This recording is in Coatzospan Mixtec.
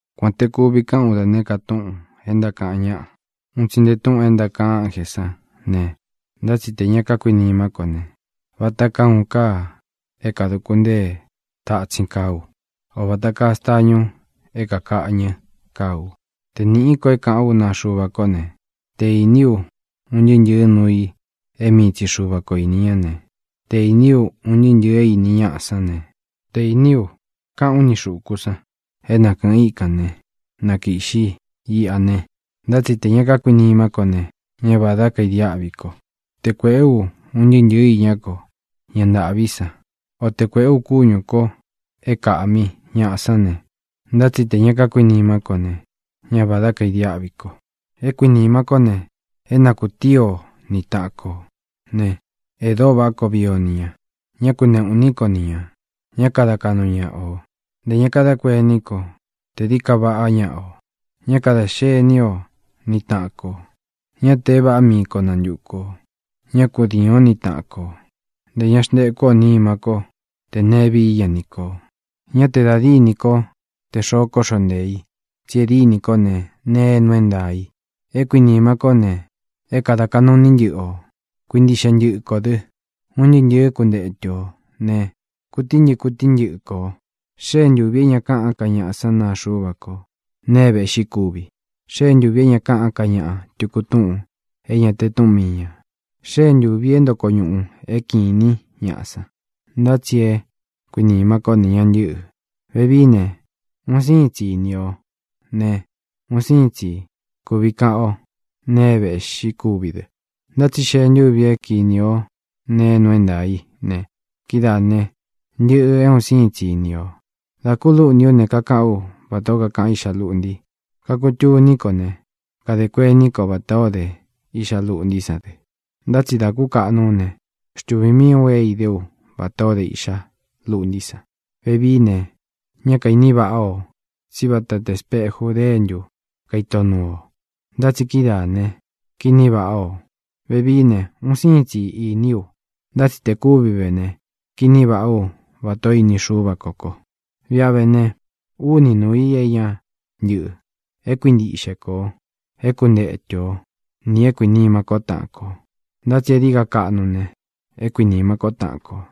Kuān te kuvi kaꞌán u da nēé ka túꞌūn é ntákaꞌan ñáꞌa, un tsi nte túꞌūn é ntákaꞌan ánjē sán ne, ntá tsi tē ña kakuinimá ko ne, vata kaa uun kaa é kānaduku ntée tatsin kaa ú, o vāta kaa stañu é kākaꞌñɨ́ kaa u. Te nīꞌí ko é kāꞌán u naa Xuva kó ne, te īní u un ntɨɨ́ ntɨ̄ɨ́ nuu i é mii tsi Xuva ko īni ñá ne, te īní u un ntɨɨ́ ntɨ̄ɨ é īni ñaꞌa sán ne, te īní u kaꞌán u ni xūku san é na kɨ̄ꞌɨn íkan ne, na kīꞌxi iꞌa ne, ntá tsi tē ña kákuinimá ko ne, ñá vādá kaidiáꞌvi ko. Te kuēꞌé u un ntɨɨ́ ntɨ̄ɨ iñá ko ña ntaꞌví san, o te kuēꞌé u kúñū ko é kāꞌmi ñaꞌa sán ne, ntá tsi tē ña kakuinimá ko ne, ñá vādá kaidiáꞌvi ko. É kuīnima kó ne, é na kūtíi o ni taꞌan kō ne, e dóo váꞌa koo vii o ni ñā. Ñá kuneꞌū iní ko ni ñā; ña kada kaꞌnu ñaꞌa ō; ntē ña kadá kuení ko te dií ka vaꞌá ñaꞌa ō. Ñá kadā xení o ni taꞌan kō; ñá te é vāꞌá mii ko nantuku ō; ñá kudiīn o ni taꞌan kó; ntē ña xntekú ō nima ko tē neé vií ña ni kō. Ña te da dínī kó te xoo kóꞌxo nteē i, tsí e dínī kó ne, nee é nuu é ntaā i. É kuīnima kó ne, é kada kaꞌnū iní ntɨꞌɨ ō. Kuintiꞌxe ntɨꞌɨ kō dɨ́. Un ntɨɨ́ ntɨ̄ɨ kuntétu ō ne, kutíi ntɨꞌɨ kutíi ntɨꞌɨ kō. Xée ntūvi é ña kaꞌán ka ñaꞌa san naa Xuva ko nee é vēꞌxí kuvi. Xée ntūvi é ña kaꞌán ka ñaꞌa tuku túꞌūn é ña te túꞌun mii ñā. Xée ntūvi é ntoko ñūꞌu é kinī ñáꞌa san. Ntá tsi é kuinīma kó ne, ña ntɨ́ꞌɨ̄. Vevií ne, un síin tsi ini o ne, un síin tsi kuvi kaꞌan o nee é vēꞌxí kuvi dɨ, ntá tsi xee ntúvi é kinī o nee é nuu é ntaā í ne, kídaā né, ntɨꞌɨ̄ é un síin tsi ini ō. Dā kulúꞌntī ú ne, kakaꞌán u vatā ó kakaꞌan iꞌxa luꞌnti. Kakutuní ko ne, kadē kuení ko vatā ó de iꞌxa luꞌntí san dɨ. Ntá tsi dā kúkaꞌnu ú ne, xtuvī mii ú é idé u vatā ó de iꞌxa luꞌntí san. Vevií ne, ñá kaīní vaꞌa o, tsí vata te speju déntu kaito nuu ō; ntá tsi kídaā ne, kiní vaꞌā o. Vevií ne, un síin tsi iní u. Ntá tsi te kúvi vé ne, kiní vāꞌá u, vatā ó ini Xúva kō ko. Viꞌa ve ne, úni nūu i é ña ntɨꞌɨ: é kuintiꞌxe kō, é kuntetu ō, nī é kuinīma kó taꞌan kō. Ntá tsi é dií ka kaꞌnu ne, é kuinīma kó taꞌan kō.